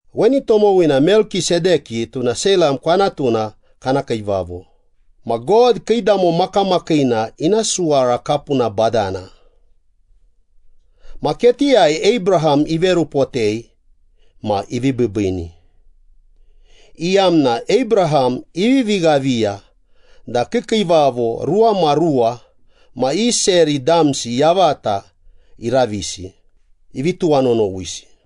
Weni tomowina Melkisedeki, tuna Seilam kwanatuna kana kiivavo, ma God kiidamo makamakiina ina suwara kapuna badana. Ma ketiyai Abraham iverupotei ma ivi biibiini, iyamna Abraham ivivi ghaviya da kiikiivavo ruwamaruwa ma i seri damsi yavata iravisi, ivi tuwanonowisi.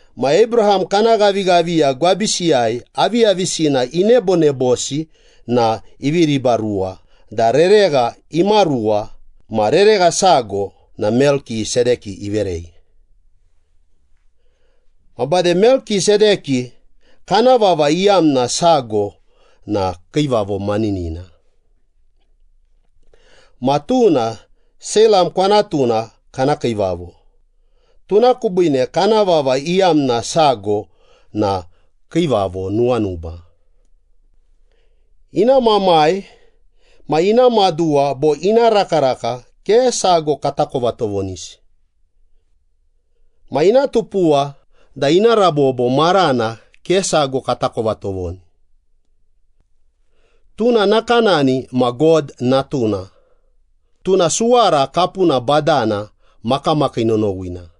Ma Abraham kana ghavighaviya gwabisiyai aviyavisina inebonebosi na ivi ribaruwa da reregha imaruwa ma reregha sago na Melkisedeki iverei. Ma bade Melkisedeki kana vava iyamna sago na ‘Kiivavo Maninina.’ Ma tuna Seilam kwanatuna kana kiivavo, tuna kubiine kana vava iyamna sago na ‘Kiivavo Nuwanuba.’ Ina mamai ma ina maduwa bo ina rakaraka ke sago katakova tovonisi. Ma ina tupuwa da ina rabobo marana ke sago katakova tovoni. Tuna nakanani ma God Natuna, tuna suwara kapuna badana makamakii nonowina.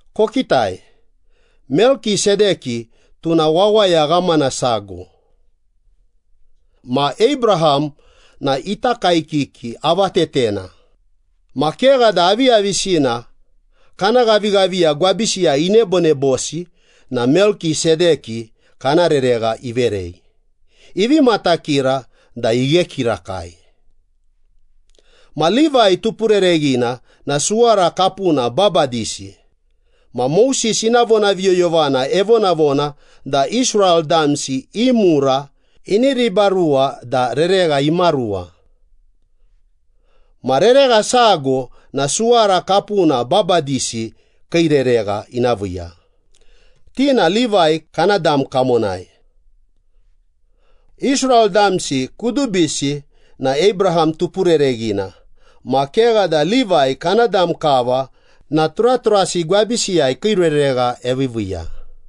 Kokitai, Melkisedeki tuna wawaya ghamana sago. Ma Abraham na ita kaekiki avatetena, ma kegha da aviyavisina kana ghavighaviya gwabisiyai inebonebosi na Melkisedeki kana reregha iverei, ivi matakira da ighe kirakai. Ma Livai tupurereghina na suwara kapuna babadisi, ma Moses ina vonaviyoyovana evonavona da Israel damsi i mura ini ribaruwa da reregha imaruwa. Ma reregha sago na suwara kapuna babadisi kii reregha ina viiya, ti na Livai kana dam kamonai. Israel damsi kudubisi na Abraham tupurereghina ma kegha da Livai kana dam kava na turaturasi gwabisiyai kii reregha eviiviiya.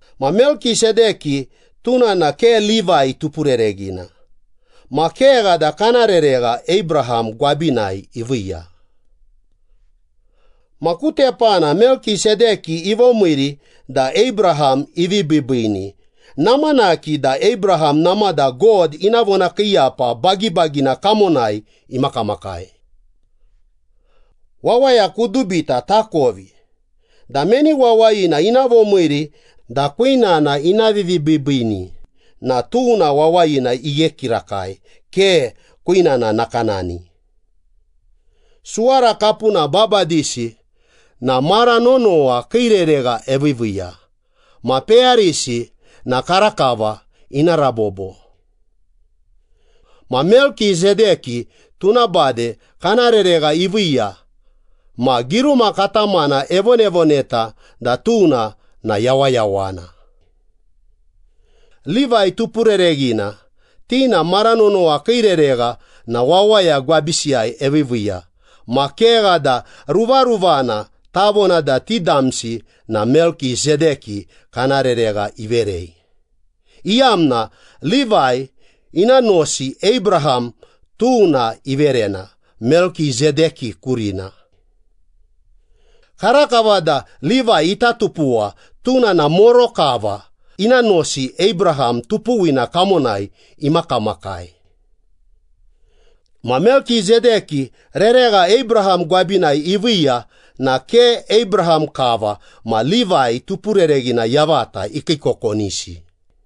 Ma Melkisedeki tuna na ke Livai tupurereghina, ma kegha da kana reregha Abraham gwabinai iviiya. Ma ku tepana Melkisedeki ivomiiri da Abraham ivi biibiini, namanaki da Abraham namada God ina vonakiiyapa bagibagina kamonai imakamakai. Wawaya kudubita takovi da meni wawayina ina vomiiri da kwinana ina vivibiibiini na tuna wawayina ighe kirakai, ke kwinana nakanani. Suwara kapuna babadisi na mara nonowa kii reregha eviiviiya ma peyarisi na karakava ina rabobo. Ma Melkisedeki tuna bade kana reregha iviiya ma giruma katamana evonavoneta da tuna na yawayawana. Livai tupurereghina, ti na mara nonowa kii reregha na wawaya gwabisiyai eviiviiya ma kegha da ruvaruvana tavona da ti damsi na Melkisedeki kana reregha iverei, iyamna Livai ina nosi Abraham tuna iverena Melkisedeki kurina. Karakava da Livai ita tupuwa, tuna na moro kava ina nosi Abraham tupuwina kamonai emakamakai. Ma Melkisedeki reregha Abraham gwabinai iviiya na ke Abraham kava ma Livai tupurereghina yavata ikiikokonisi.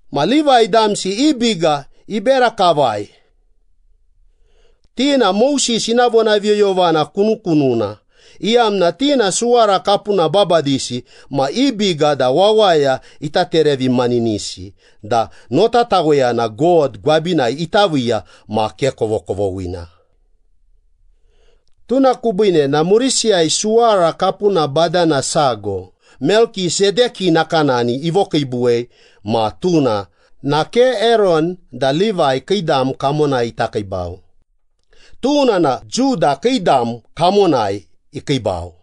Ma Livai damsi i biga ibera kavai. Ti na Moses ina vonaviyoyovana kunukununa, iyamna ti na suwara kapuna babadisi ma i biga da wawaya ita terevimaninisi da notataweyana God gwabinai ita viiya ma ke kovokovoghina. Tuna kubiine na murisiyai suwara kapuna badana sago Melkisedeki nakanani ivokiibuwei ma tuna na ke Eron da Livai kii dam kamonai ita kiibau, tuna na Juda kii dam kamonai ikiibau.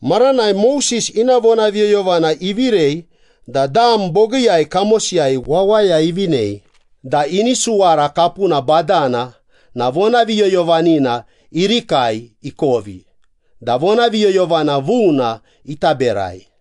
Maranai Moses ina vonaviyoyovana ivirei da dam bogiiyai kamosiyai wawaya ivinei da ini suwara kapuna badana na vonaviyoyovanina irikai ikovi da vonaviyoyovana vuna ita berai.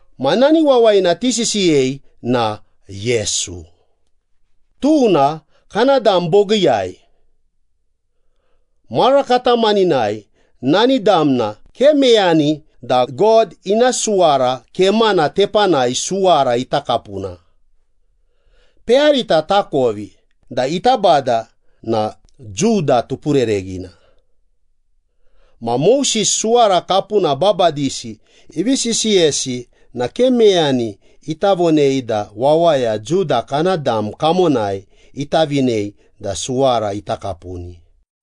Ma nani wawayina tisisiyei na Yesu, tuna kana dam bogiiyai. Mara katamaninai nani damna ke meyani da God ina suwara kemana tepanai suwara ita kapuna. Peyarita takovi da ita Bada na Juda tupurereghina. Ma Moses suwara kapuna babadisi ivi sisiyesi na ke meyani ita vonei da wawaya Juda kana dam kamonai ita vinei da suwara ita kapuni.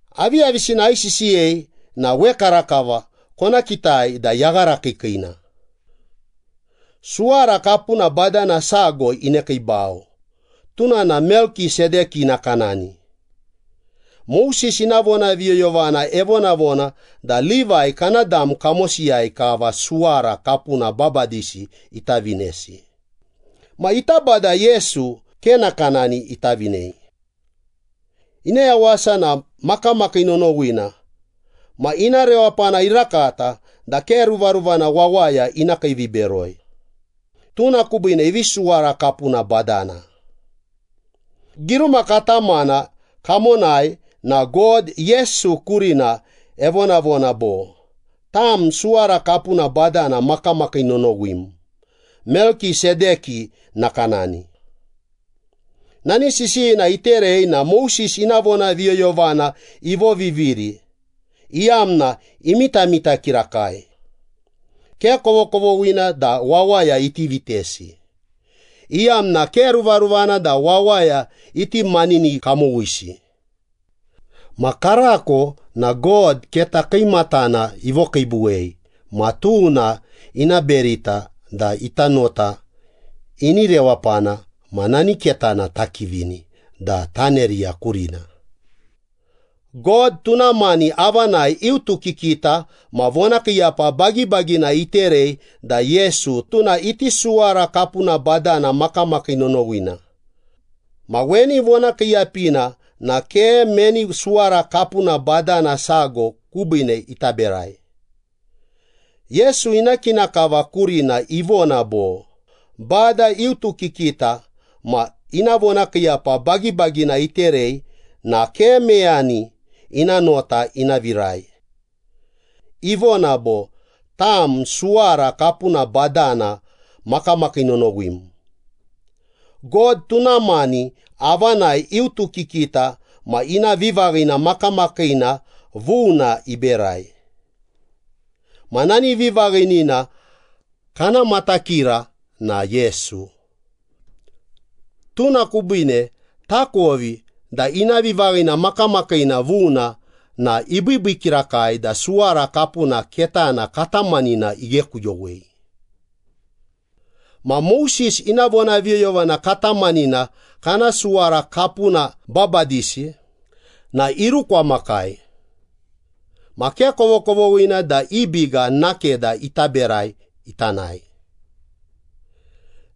Aviyavisina aisisiyei na wekarakava kona kitai da yaghara kiikiina. Suwara kapuna badana sago inekiibau, tuna na Melkisedeki nakanani. Moses ina vonaviyoyovana evonavona da Livai kana dam kamosiyai kava suwara kapuna babadisi ita vinesi, ma ita Bada Yesu ke nakanani ita vinei. Ina yawasa na makamakii nonowina ma ina rewapana irakata da ke ruvaruvana wawaya ina kiiviberoi. Tuna kubiine ivi suwara kapuna badana. Giruma katamana kamonai na God Yesu kurina evonavona bo, “Tam suwara kapuna badana makamakii nonowim, Melkisedeki nakanani.” Nani sisiyina iterei na Moses ina vonaviyoyovana ivoviviri, iyamna imitamita kirakai. Ke kovokovoghina da wawaya iti vitesi, iyamna ke ruvaruvana da wawaya iti manini kamowisi. Ma karako na God keta kiimatana ivokiibuwei ma tuna ina berita da ita nota ini rewapana ma nani ketana takivini da taneriya kurina. God tuna mani avanai iutukikita ma vonakiiyapa bagibagina iterei da Yesu tuna iti suwara kapuna badana makamakii nonowina, ma weni vonakiiyapina na ke meni suwara kapuna badana sago kubiine ita berai. Yesu ina kina kava kurina ivona bo, “Bada iutukikita ma ina ivonakiiyapa bagibagina iterei na ke meyani ina nota ina virai. Ivona bo, ‘Tam suwara kapuna badana makamakii nonowim.’” God tuna mani avanai iutukikita ma ina vivaghina makamakiina vuna iberai. Ma nani vivaghinina kana matakira na Yesu. Tuna kubiine takovi da ina vivaghina makamakiina vuna na ibiibii kirakai da suwara kapuna ketana katamanina ighekuyowei. Ma Moses ina vonaviyoyovana katamanina kana suwara kapuna babadisi na irukwamakai, ma ke kovokovoghina da i biga nakeda ita berai ita nae.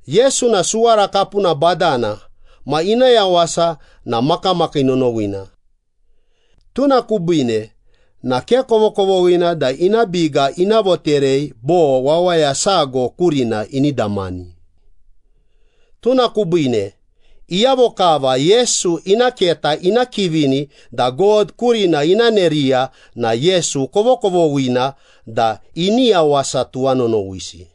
Yesu na suwara kapuna badana ma ina yawasa na makamakii nonowina. Tuna kubiine na ke kovokovoghina da ina biga ina voterei bo wawaya sago kurina ini damani. Tuna kubiine, iyavo kava Yesu ina keta ina kivini da God kurina ina neriya na Yesu kovokovoghina da ini yawasa tuwanonowisi.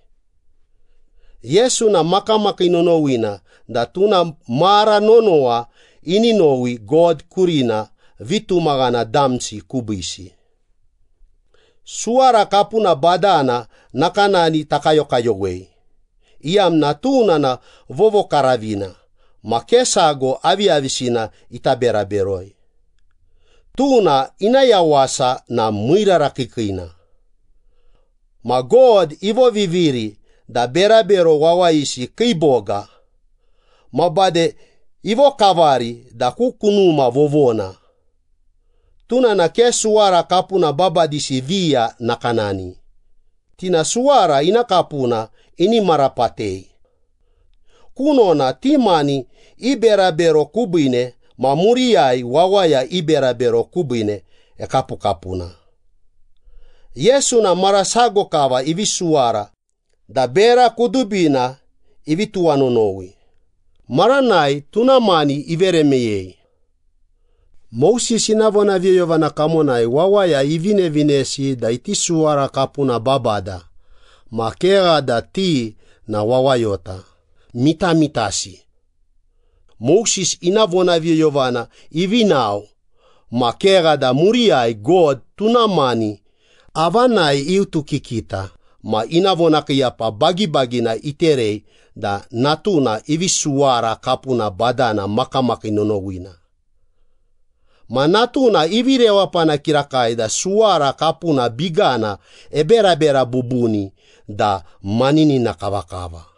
Yesu na makamakii nonowina da tuna mara nonowa ini nowi God kurina vitumaghana damsi kubiisi. Suwara kapuna badana nakanani takayokayowei, iyamna tuna na vovokaravina ma ke sago aviyavisina ita bera beroi. Tuna ina yawasa na miirara kiikiina. Ma God ivoviviri da berabero wawayisi kii boga. Ma bade ivokavari da ku kunuma vovona. Tuna na ke suwara kapuna babadisi viya nakanani, ti na suwara ina kapuna ini marapatei. Kunona ti mani i berabero kubiine ma muriyai wawaya i berabero kubiine ekapukapuna. Yesu na mara sago kava ivi suwara da bera kudubina ivi tuwanonowi, maranai tuna mani ivere meyei. Moses ina vonaviyoyovana kamonai wawaya ivinevinesi da iti suwara kapuna babada, ma kegha da ti na wawayota, mitamitasi. Moses ina vonaviyoyovana ivi nao, ma kegha da muriyai God tuna mani avanai iutukikita ma ina vonakiiyapa bagibagina iterei da Natuna ivi suwara kapuna badana makamakii nonowina. Ma Natuna ivi rewapana kirakai da suwara kapuna bigana eberabera bubuni da maninina kavakava.